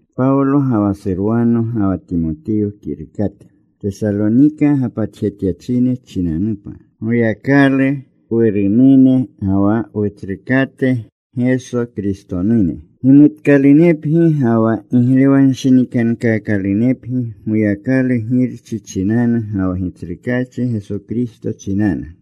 Pawlo ga wa Surwano ga wa Timotiyo kirukate, Tesalonika gapatjetyachine chinanupa, Goyakalu Wurunune ga wa Wutsrukate Geso Kristonune. Gimutkalunepgi ga wa giglewanshinikankaakalunepgi Goyakalu Girchi chinanu ga wa Gitsrukaachi Geso Kristo chinanu.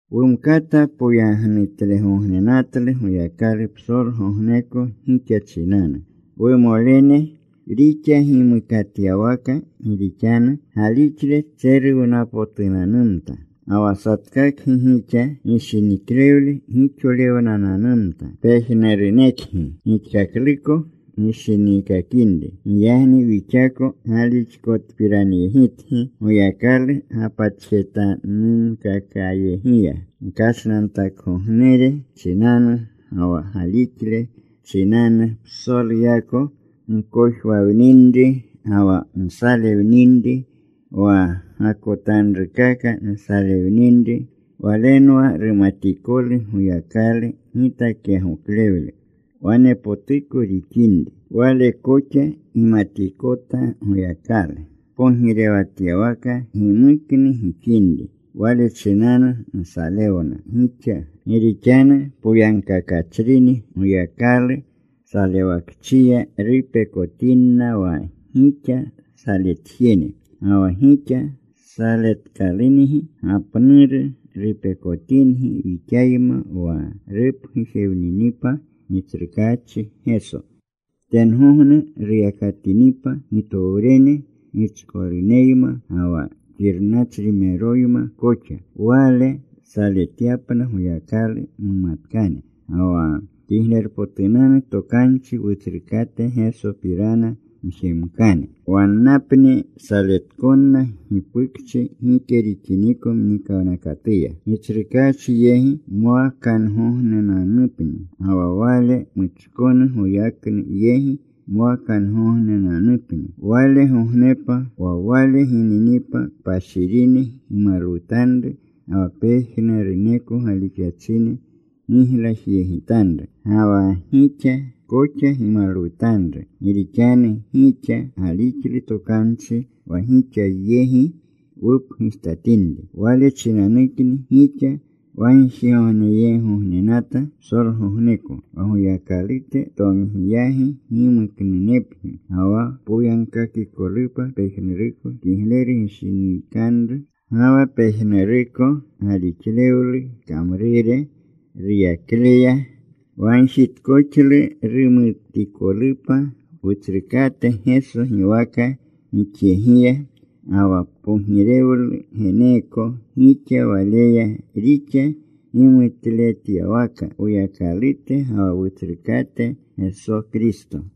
Wumkata poyagnutlegognenatlu Goyakalu psolgogneko gixa chinanu, wumolene, rixa gimukatyawaka, gi rixanu galixle tseruwnapotunanumta. Ga wa satkakgi gixa gishiniklewle gixolewnananumta, pejnurunekgi gixkakluko gishiniikakinri. Giyagni wixako galixkotpiranyegitgi Goyakalu gapatjetanunkakayegiya, gkashnantakgognere chinanu, ga wa galixle chinanu psoluyako gkojwawninri ga wa nsalewninri wa gakotanrukaka nsalewninri. Walenwa rumatikolu Goyakalu gitakyagoklewle wanepotuko rixinri. Wale koxa gimatikota Goyakalu pogirewatyawaka gimuknu gixinri. Wale chinanu nsalewna gixa. Gi rixanu poyagkakachrini Goyakalu salewakchiya rupekotinna wa gixa saletjene. Ga wa gixa saletkalungi gapnanru rupekotingi wixayma wa rupgujewninipa Gitsrukaachi Geso, tengogne ruyakatinipa gitowrene gichkoluneyma ga wa xirnachrimeroyma koxa, Wale saletyapna Goyakalu mumatkane, ga wa Kiglerpotunanu Tokanchi Wutsrukate Gesopirana mjemkane. Wannapni saletkonna gipukchi gike rixiniko mnikawnakatuya, Gitsrukaachi yegi mwakangognenanupni, ga wa Wale muchkonu goyaknu yegi mwakangognenanupni. Walegognepa wa Wale gininipa kpashirine gimalwutanru ga wa pejnuruneko galixachine giglajyegitanru. Ga wa gixa koxa gimalwutanru gi rixanu gixa galixlu tokanchi wa gixa yegi wupgujtatinri. Wale chinanukni gixa wagjigogneyeegognenata psolgogneko, wa Woyakalute tomgiyagi gimuknunepgi, ga wa poyagkakikolupa pejnuruko kigleru gishiniikaluru ga wa pejnuruko galixlewlu kamrure ruyakleya. Wagjitkoxlu rumalwutikolupa Wutsrukate Geso giwaka gixyegiya, ga wa pogirewlu geneeko gixa Waleya, rixa gimutlewletyawaka Woyakalute ga wa Wutsrukate Geso Kristo.